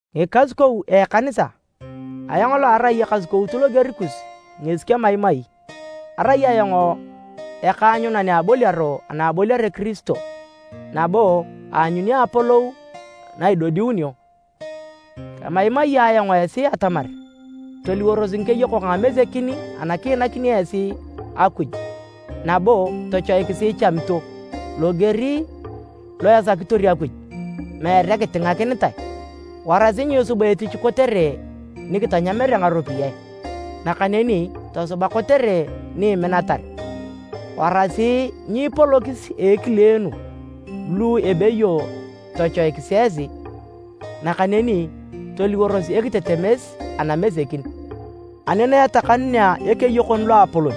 Ngikasukou a ekanisa! Ayong lo arai ekasukout loger kus ngesi kemaimai. Arai ayong ekaanyunan a aboliaro ana aboliare Kirisio, nabo aanyuni apolou na idodiunio. Kemaimai ayong esi atamar toliworos ngikeyokok a ngamesekin ana kiinakini esi Akuj nabo tochoikisi ichamito, loger lo esakitor Akuj, meere kitingakinitae. Warasi nyiisuba etich kotere ni kitanyamere ngaropiyae, nakaneni tosuba kotere ni iminatar. Warasi nyiipolokis a ekileenu lu ebeyo tochoikis esi, nakaneni toliworos ekitetemes anamesekin. Ani na etakanunea Ekeyokon Loapolon,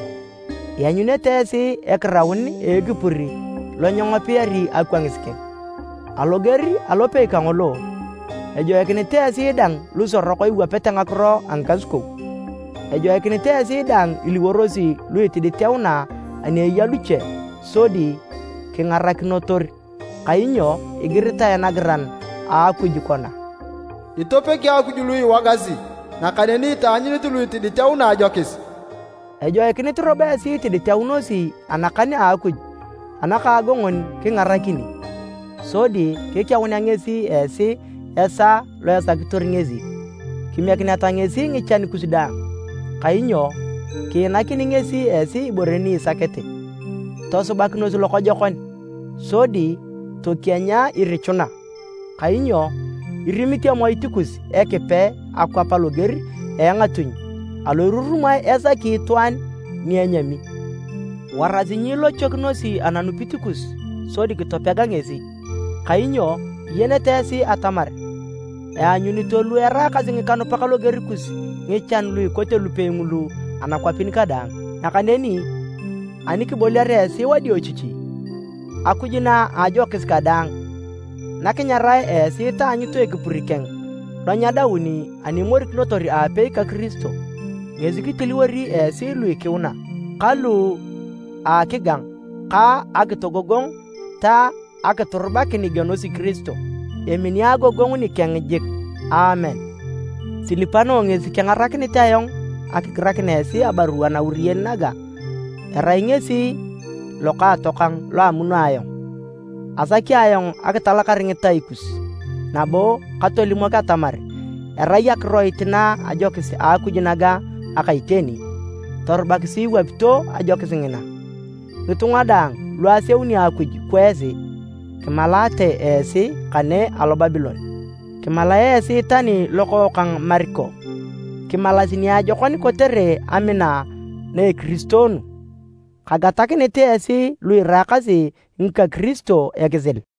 ianyunete esi ekiraun a ekipur lo nyengopiari akwangis keng. Aloger alopei kangolo, ejoikinit esi dang lusorok iwapete ngakiro a ngikasukou. Ejoikinit esi daang iliworosi lu itiditeuna ani eya luche sodi kingaranakinotor, kainyo igiritae nagiran a Akuj kona, “Itopegi Akuj lu iwogasi, nakaneni itaanyunit lu itiditeuna ajokis.” Ejoikinit robo esi itiditeunosi anakan a Akuj anakaagongon kingarakini, sodi kikeunea ngesi esi esaa lo esakitor ngesi. Kimiekineta ngesi ngichan kus daang, kainyo kiinakini ngesi esi ibore ni isakete. Tosubakinos lokojokon, sodi tokienya irichuna! Kainyo irimit emoit kus Ekipe akwap loger a engatuny alo irurumae esaki itwaan ni enyami. Warasi nyiilochokinosi ananupit kus sodi kitopega ngesi, kainyo iyenete esi atamar eanyunito lu eraakasi ngikanupak loger kus ngichan lu ikote lupei ngulu anakwapin kadaang. Nakaneni ani kiboliare esi wadiochichi, Akuj na a ajokis kadaang, na kinyarae esi taanyut ekipur keng lo nyedaun ani imorikinotor aapei ka Kiristo, ngesi kitiliwori esi lu ikiuna, ka lu akigang, ka akitogogong ta akiturubakin igienosi Kiristo. Emini agogongu nikeng jik! Aamen. Silipano ngesi kengarakinit ayong akigirakin esi abarua nauriyen naga, erai ngesi lokaatokang lo amuno ayong. Asaki ayong akitalakar ngitai kus nabo katolimok atamar erai akiroit na a ajokis a Akuj naga aka iteni. Torubakisi iwapito ajokis ngina. Ngitunga daang lu aseuni Akuj kwa esi, kimalaate esi kane alo Babilon. Kimalae esi tani lokookang Mariko. Kimalas niajokon kotere amina na ekiristoonu. Kagatakinit esi lu iraakasi ngika Kiristo ekisil.